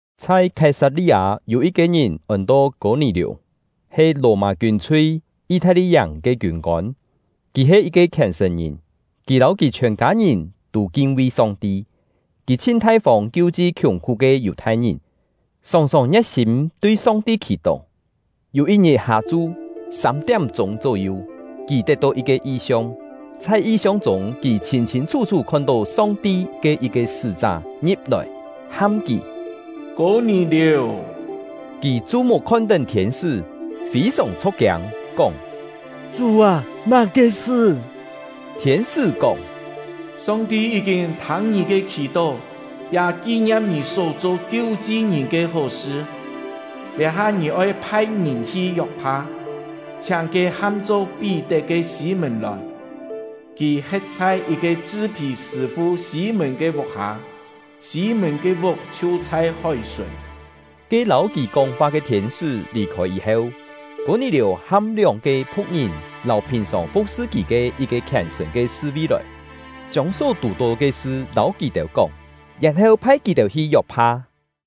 Chhai Khái-sat-li-â yû yit-ke ngìn ôn-to Kô-nì-liù, he Lò-mâ kiûn-chhui “Yi-thai-li-yàng” ke kiûn-kôn. Kì he yit-ke khièn-sṳ̀n-ngìn; kì lâu kì chhiòn kâ-ngìn tû kin-vi Song-ti; kì chhin thai-fông kiu-chi khiùng-khú ke Yù-thai-ngìn, sòng-sòng ngie̍t-sîm tui Song-ti khì-tó. Yû yit-ngit hâ-chu, sâm-tiám-chûng chó-yu, kì tet-tó yit-ke yi-siong; chhai yi-siong chûng, kì chhîn-chhîn chhú-chhú khon-tó Song-ti ke yit-ke sṳ́-chá ngi̍p-lòi, ham kì: “Kô-nì-liù!” Kì chu-muk khon-tén thiên-sṳ́, fî-sòng chho̍k-kiâng, kóng: “Chú â, má-ke sṳ?” Thiên-sṳ́ kóng: “Song-ti yí-kîn thâng ngì ke khì-tó, ya ki-ngiam ngì só-cho kiu-chi ngìn ke hó-sṳ. Liá-ha ngì oi phai-ngìn hi Yok-pha, chhiáng ke ham-cho Pí-tet ke Sî-mùn lòi. Kì he̍t chhai yit-ke chṳ-phì sṳ̂-fu Sî-mùn ke vuk-hâ; Sî-mùn ke vuk chhiu chhai hói-sùn.” Ke lâu kì kóng-fa ke thiên-sṳ́ lì-khôi yî-heu, Kô-nì-liù ham lióng-ke phu̍k-ngìn lâu phìn-sòng fu̍k-sṳ kì ke yit-ke khièn-sṳ̀n ke sṳ-ví lòi, chiông só tù-tó ke sṳ lâu kì-têu kóng, yèn-heu phai kì-têu hi Yok-pha.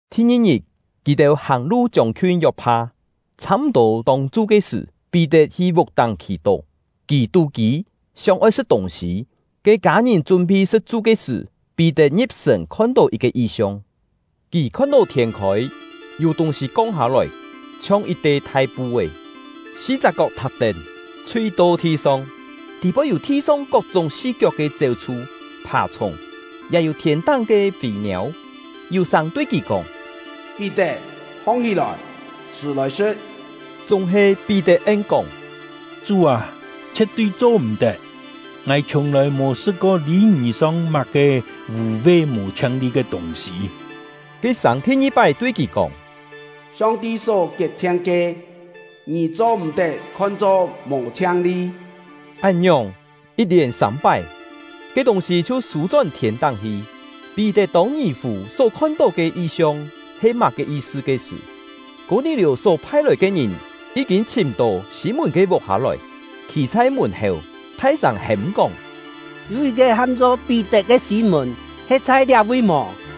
Thi-ngi-ngit, kì-têu hàng-lu chiông-khiun Yok-pha. Chhâ-m̀-tô tông-chu ke sṳ̀, Pí-tet hi vuk-táng khì-tó. Kì tú-kî, sióng-oi sṳ̍t tûng-sî; ke kâ-ngìn chún-phi sṳ̍t-chu ke sṳ̀, Pí-tet ngi̍p-sṳ̀n khon-tó yit-ke yi-siong. Kì khon-tó thiên-khôi, yû tûng-sî kong hâ-lòi, chhiong yit-te thai pu-é, si-chak kok thak-tén, chhui-to thi-song, tî-poi yû thi-song kok-chúng si-kiok ke chéu-chhu, phà-chhùng, ya yû thiên-táng ke fî-niâu. Yû sâng tui kì kóng: “Pí-tet, hong-hí-lòi, chhṳ̀ lòi sṳ̍t!” Chúng-he Pí-tet en-kóng: “Chú â, chhie̍t-tui cho-m̀-tet! Ngài chhiùng-lòi mò sṳ̍t-ko lî-ngì song má-ke vû-ve mò chhiang-li ke tûng-sî.” Ke sâng thi-ngi-pái tui kì kóng: “Song-ti só kiet-chhiang ke, ngì cho-m̀-tet khon-cho mò chhiang-li.” Án-ngiòng yit-lièn sâm-pái, ke tûng-sî chhiu sû-chón thiên-táng hi. Pí-tet tông ngì-fù só khon-tó ke yi-siong he má-ke yi-sṳ ke sṳ̀, Kô-nì-liù só phai-lòi ke ngìn yí-kîn chhìm-tó Sî-mùn ke vuk-hâ lòi, khî chhai mùn-héu, thai-sâng hêm-kóng: “Yû yit-ke ham-cho Pí-tet ke Sî-mùn he̍t chhai liá-vi mò?”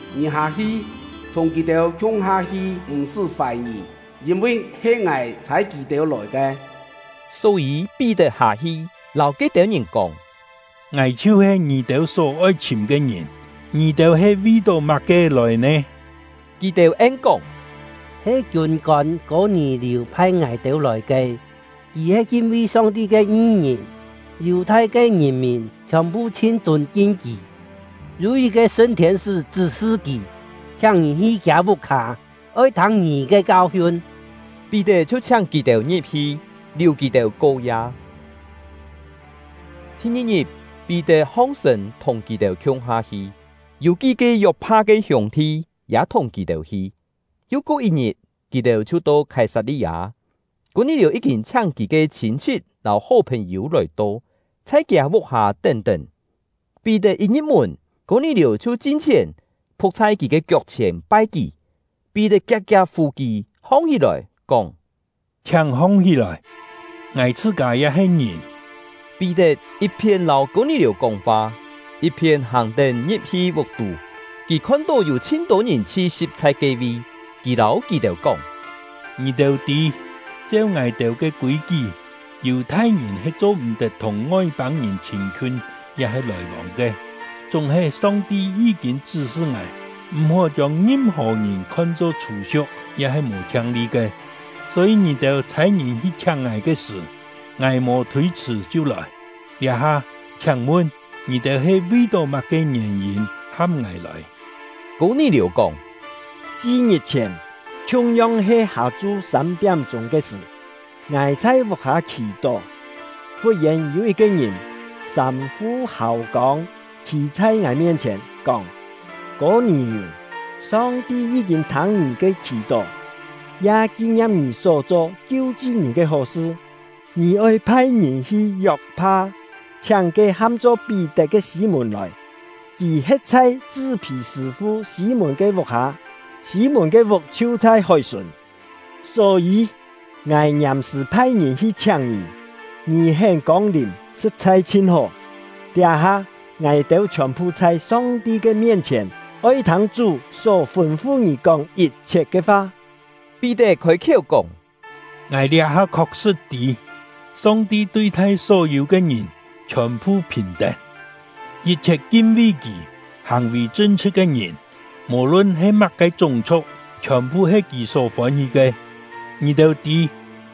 Ngì hâ-hi, thùng kì-têu khiung-ha hi, m̀-sṳ́ fài-ngì, yîn-vi he Ngài chhâi kì-têu lòi ke.” Só-yî Pí-tet hâ-hi, lâu ke-têu ngìn kóng: “Ngài chhiu-he ngì-têu só-oi chhìm ke ngìn. Ngì-têu he vi-tó má-ke lòi nè?” Kì-têu en-kóng: “He kiûn-kôn Kô-nì-liù phai ngài-têu lòi ke; kì he kin-vi Song-ti ke ngi-ngìn, Yù-thai ke ngìn-mìn chhiòn-phu chhin chûn-kin kì. Yû yit-ke sṳn thiên-sṳ́ chṳ́-sṳ kì, chhiáng ngì hi kiâ vuk-hâ, oi thâng ngì ke kau-hiun.” Pí-tet chhiu chhiáng kì-têu ngi̍p-hi, liù kì-têu ko-ya. Thi-ngi-ngit, Pí-tet hong-sṳ̂n thùng kì-têu khiung-ha hi; yû kí-ke Yok-pha ke hiûng-thi ya thùng kì-têu hi. Yu ko yit-ngit, kì-têu chhiu to Khái-sat-li-â. Kô-nì-liù yí-kîn chhiáng kì ke chhîn-chhit lâu hó phèn-yû lòi-to, chhai kiâ vuk-hâ tén-tén. Pí-tet yit ngi̍p-mùn, Kô-nì-liù chhiu chin-chhièn, phu̍k chhai kì ke kiok-chhièn pai kì. Pí-tet kiak-kiak fù kì hong-hí-lòi, kóng: “Chhiáng hong-hí-lòi, ngài chhṳ-kâ ya he ngìn.” Pí-tet yit-phién lâu Kô-nì-liù kóng-fa, yit-phién hàng-tén ngi̍p-hi vuk-tú; kì khon-tó yû chhin-tô ngìn chhi-si̍p chhai ke-vi. Kì lâu kì-têu kóng: “Ngì-têu tî, cheu ngài-têu ke kûi-kí, Yù-thai-ngìn he cho-m̀-tet thùng Ngoi-pâng-ngìn chhîn-khiun ya-he lòi-vông ke; chúng-he Song-ti yí-kîn chṳ́-sṳ ngài, m̀-hó chiông ngim-hò ngìn khon-cho chhû-siu̍k ya-he mò chhiang-li ke. Só-yî ngì-têu chhâi ngìn hi chhiáng ngài ke sṳ̀, ngài mò thôi-chhṳ̀ chhiu lòi. Liá-ha, chhiáng mun, ngì-têu he vi-tó má-ke ngièn-yîn ham ngài lòi?” Kô-nì-liù kóng: “Si-ngit-chhièn, khiung-yong he hâ-chu sâm-tiám-chûng ke sṳ̀, ngài chhai vuk-hâ khì-tó. Fut-yèn yû yit-ke ngìn, sâm-fu hâu-kông, khî chhai ngài mien-chhièn, kóng: ‘Kô-nì-liù! Song-ti yí-kîn thâng ngì ke khì-tó, ya ki-ngiam ngì só cho kiu-chi ngìn ke hó-sṳ. Ngì oi phai-ngìn hi Yok-pha, chhiáng ke ham-cho Pí-tet ke Sî-mùn lòi. Kì he̍t chhai chṳ-phì sṳ̂-fu Sî-mùn ke vuk-hâ; Sî-mùn ke vuk chhiu chhai hói-sùn.’ Só-yî, ngài ngiàm-sṳ̀ phai-ngìn hi chhiáng ngì; ngì hén kông-lìm, sṳ̍t-chhai chhin hó. Liá-ha, ngài-têu chhiòn-phu chhai Song-ti ke mien-chhièn, oi thâng Chú só fûn-fu ngì kóng yit-chhiet ke fa.” Pí-tet khôi-khiéu kóng: “Ngài liá-ha khok-sṳ̍t tî: Song-ti tui-thai só-yû ke ngìn chhiòn-phu phìn-tén. Yit-chhiet kin-vi Kì, hàng-vì chṳn-chhṳ̍t ke ngìn, mò-lun he má-ke chúng-chhu̍k, chhiòn-phu he Kì só fôn-hí ke. Ngì-têu tî,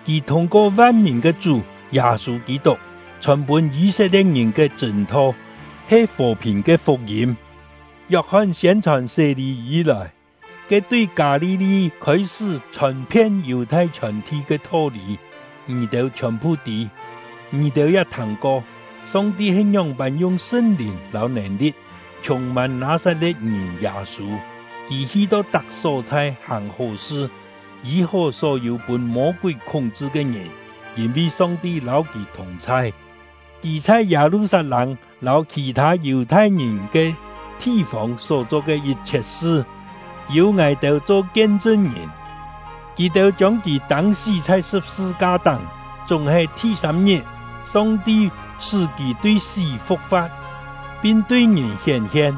Kì thûng-ko van-mìn ke Chú — Yâ-sû Kî-tuk, chhòn-pûn Yî-set-lie̍t-ngìn ke chṳ̂n-tho he fò-phìn ke fuk-yîm. Yok-hon siên-chhòn sé-lî yî-lòi, ke tui Kâ-li-li khôi-sṳ́ chhòn-phien Yù-thai chhiòn-thi ke tho-lî, ngì-têu chhiòn-phu tî. Ngì-têu ya thâng-ko: Song-ti he ngióng-pân yung Sṳn-Lìn lâu nèn-li̍t chhûng-mân Nâ-sat-le̍t-ngìn Yâ-sû. Kì hi-to tak só-chhai hàng hó-sṳ, yî-hó só-yû pûn Mô-kúi khúng-chṳ ke ngìn, yîn-vi Song-ti lâu kì thùng-chhai. Kì chhai Yâ-lu-sat-lâng lâu khì-thâ Yù-thai-ngìn ke thi-fông só cho ke yit-chhiet sṳ, yû ngài-têu cho kien-chṳn-ngìn. Kì-têu chiông kì tâng-sí chhai sṳ̍p-sṳ-ka-táng; chúng-he, thi-sâm-ngit, Song-ti sṳ́ kì tui sí fu̍k-fa̍t, pin tui ngìn hién-hien.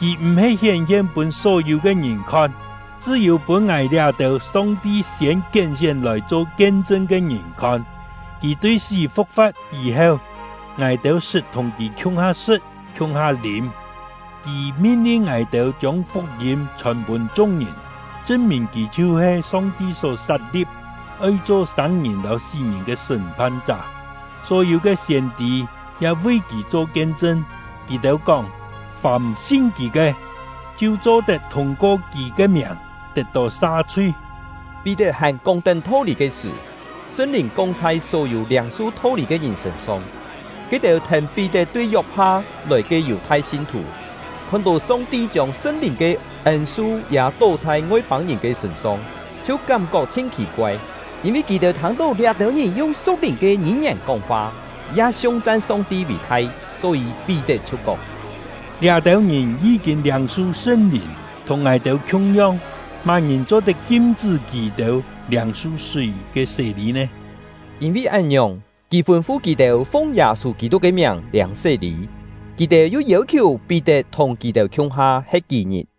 Kì m̀-he hién-hien pûn só-yû ke ngìn khon, chṳ́-yû pûn ngài liá-têu Song-ti siên kién-sién lòi cho kien-chṳn ke ngìn khon. Kì tui sí fu̍k-fa̍t yî-heu, ngài-têu sṳt thùng kì khiung-ha sṳ̍t khiung-ha lîm. Kì min-lin ngài-têu chiông fuk-yîm chhòn pûn chung-ngìn, chṳn-mìn kì chhiu-he Song-ti só sat-li̍p, oi cho sâng-ngìn lâu sí-ngìn ke sṳ́m-phan-chá. Só-yû ke siên-tî ya vi kì cho kien-chṳn; kì-têu kóng: Fàm sin kì ke, chhiu cho-tet thûng-ko kì ke miàng tet-tó sa-chhui.” Pí-tet hàn kóng-tén tho-lî ke sṳ̀, Sṳn-Lìn kong chhai só-yû liâng-su tho-lî ke ngìn sṳ̂n-song. Ke-têu thèn Pí-tet tui Yok-pha lòi ke Yù-thai sin-thù, khon-tó Song-ti chiông Sṳn-Lìn ke ên-su ya tó chhai Ngoi-pâng-ngìn ke sṳ̂n-song, chhiu kám-kok chhin khì-koai; yîn-vi kì-têu thâng-tó liá-têu ngìn yung su̍k-lìn ke ngî-ngièn kóng-fa, ya siung-chan Song-ti vì-thai. Só-yî Pí-tet chhiu kóng: “Liá-têu ngìn yí-kîn liâng-su Sṳn-Lìn, thùng ngài-têu khiung-yong; má-ngìn cho-tet kim-chṳ́ kì-têu liâng-su súi ke sé-lî nè?” Yîn-vi án-ngiòng, kì fûn-fu kì-têu fung Yâ-sû Kî-tuk ke miàng liâng sé-lî. Kì-têu yu yêu-khiù Pí-tet thùng kì-têu khiung-ha he̍t kí-ngit.